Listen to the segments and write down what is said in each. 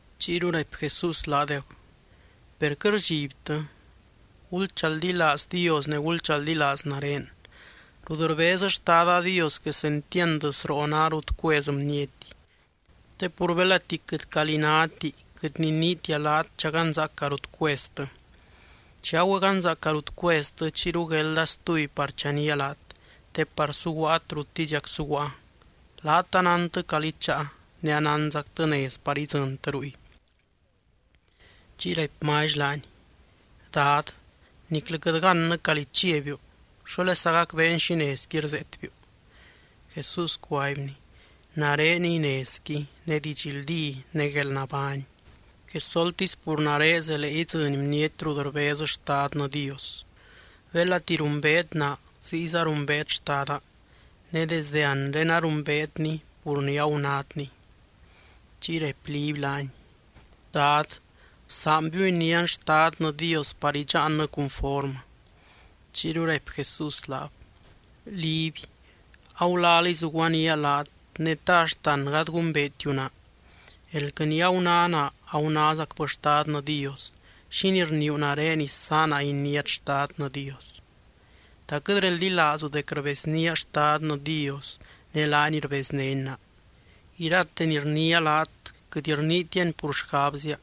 Chiyru raipy Jesús laadeb: —Per quɨt rdxibtɨ. Gulchaldilaaz Dios ne gulchaldilaaz nare. Rut rbez Xtada Dios quesentiand sroo ná rut cuez bniety. Te pur belati quɨt calí náti, quɨt niniitia laat chaganzaaca rut cueztɨ. Chi agüeganzaaca rut cueztɨ, chiyru guelda stuby par chanía laat, te par suguaat ruttiziac suguaa. Laat anántɨ calí cháa, ne anánzactɨ nez par idzɨntɨ ruy. Chiy raipy Mally laany: —Dad, niclɨ quɨt gannɨ calí chiabiu. ¿Xólesa gacbeen xi nezqui rzeetbiu? Jesús cuaibny: —Nareniy nezqui, ne didxldí, ne guelnabány. Quesoltisy pur nare zelee idzɨny bniety rut rbez Xtadnɨ Dios. Belati rumbeet naa ziyza rumbeet Xtada. Ne desde anre arumbeetny pur ni agunátny. Chiy raipy Liby laany: —Dad, bsaanbiu inián Xtadnɨ Dios par idxaannɨ cunformɨ. Chiyru raipy Jesús laab: —Liby, agulaliy zuguaníaa laat ne, ¿ta axt an gady gumbeetiu naa? Elquɨ ni aguná naa, agunázacbɨ Xtadnɨ Dios. ¿Xínii rniiu nare isaana iniát Xtadnɨ Dios? ¿Ta quɨt reldilaazu dec rbeznía Xtadnɨ Dios, ne laany rbeznény naa? Irate ni rniia laat quɨt rniitiani pur xgabzia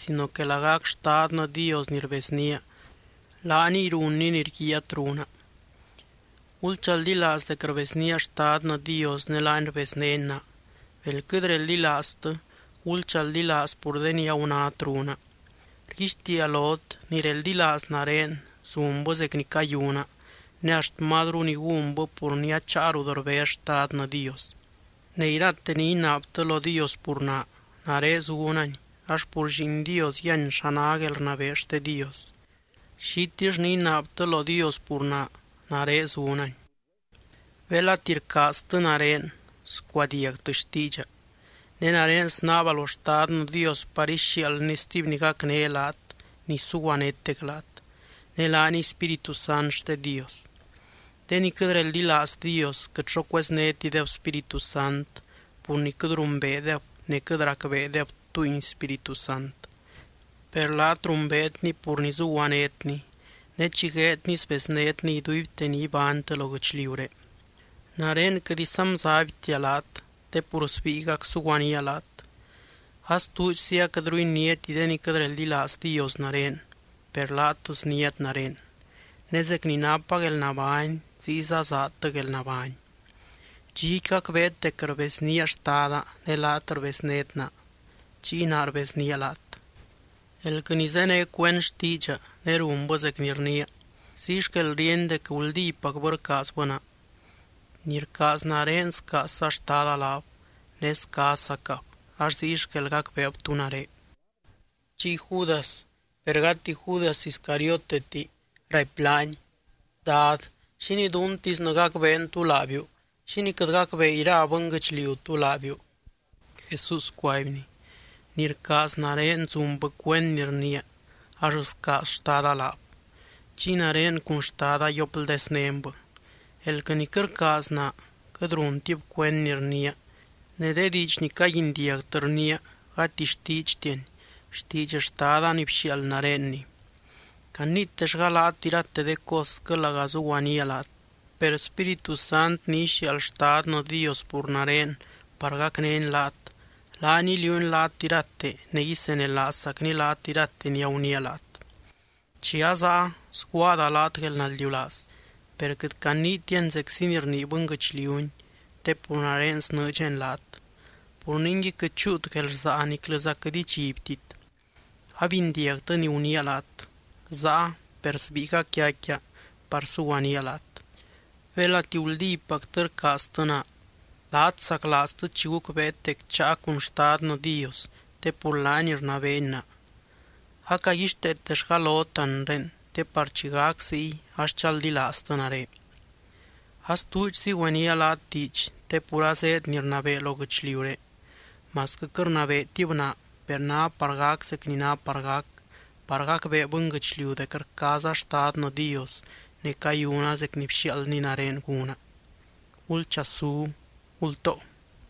sino que lagac Xtadnɨ Dios ni rbeznía, laaniy runny ni rguiaat runa. Gulchaldilaaz dec rbeznía Xtadnɨ Dios, ne laany rbeznény naa. Bel quɨt reldilaaztɨ, gulchaldilaaz pur de ni agunát runa. Rguixtiia lot, ni reldilaaz nare zunbɨ zec ni cayuna, ne axt mazru ni gúnbɨ pur ni acháa rut rbez Xtadnɨ Dios. Ne irate ni inaabtɨ lo Dios pur naa, nare zunani ax pur Lliin Dios yíany xa ná guelrnabee xte Dios. Xitill ni inaabtɨ lo Dios pur naa, nare zunani. ’Belati rcaaztɨ nare, scuadiagtɨ xtiidxa. Ne nare snaaba lo Xtadnɨ Dios par ixiaaldny stuby ni gacné laat, ni suguanétec laat. Ne laaniy Spíritu Sant xte Dios. De ni quɨt reldilaaz Dios, quɨt xo cueznétideb Spíritu Sant, pur ni quɨt rumbeedeb ne quɨt racbeedeb túngui Spíritu Sant. Per laat rumbeetny pur ni zuguanétny, ne chi gueedny sbeznétny iduibte ni ibánytɨ lo guɨchliuré. Nare quɨt isanbzaibtia laat te pur sbíigac suguanía laat. Astuudxzi aquɨtru iniáti de ni quɨt reldilaaz Dios nare, per laat sniát nare. Ne zec ni napa guelnabány ziyza zaadtɨ guelnabány. Dxiqui gacbeet dec rbeznía Xtada, ne laat rbeznét naa, chiy naa rbeznía laat. Elquɨ ni zéne cuend xtiidxa, ne runbɨ zec ni rniia, ziy xquel ríeny dec guldípacbɨ rcaazbɨ naa. Ni rcaaz nare scaazza Xtada laab, ne scaazzacab, ax ziy xquel gacbeeb tú nare. Chiy Judas, (per gati Judas Iscarioteti) raipy laany: —Dad, ¿xínii duntisnɨ gacbeen tú laabiu? ¿Xínii quɨt gacbee ira bɨnguɨchliu tú laabiu? Jesús cuaibny: —Ni rcaaz nare, zunbɨ cuend ni rniia, ax scaaz Xtada laab. Chiy nare cun Xtada yiopldeznénbɨ. Elquɨ ni quɨt rcaaz naa, quɨt runtib cuend ni rniia. Ne de diidx ni caguindiagtɨ rniia, gati xtiidxtiani, xtiidx Xtada ni bxiaald narenni. ’Caniitellga laat irate de cosquɨ laga zuguaníaa laat. Per Spíritu Sant ni ixiaald Xtadnɨ Dios pur nare par gacnény laat, laany iliuuny laat irate ne isenelaazzacny laat irate ni aguniia laat. ’Chi azaa sguaada laat guelnaldiulaaz, per quɨt caniitiani zeczi ni rnii bɨnguɨchliuni, te pur nare snɨɨdxani laat. Pur ningui quɨt chúut guelrsaa niclɨza quɨt idxibtit. Abindiagtɨ ni guniia laat, záa per sbíigac yaicquia par suguanía laat. Belati guldípactɨ rcaaztɨ naa, laat saclaaztɨ chi gucbeet dec cháa cun Xtadnɨ Dios te pur laany rnabeeny naa. Acaguixteetellga lot anre, te par chi gac ziy ax chaldilaaztɨ nare. ’Astuudxzi güenía laat diidx te pur azéed ni rnabee lo guɨchliuré. Masquɨ quɨt rnabeetib naa, per ná par gac zec ni ná par gac, par gacbee bɨnguɨchliu dec rcaaza Xtadnɨ Dios, ne cayuna zec ni bxiaaldny nare gúna. ’Gulchasú, gultoo.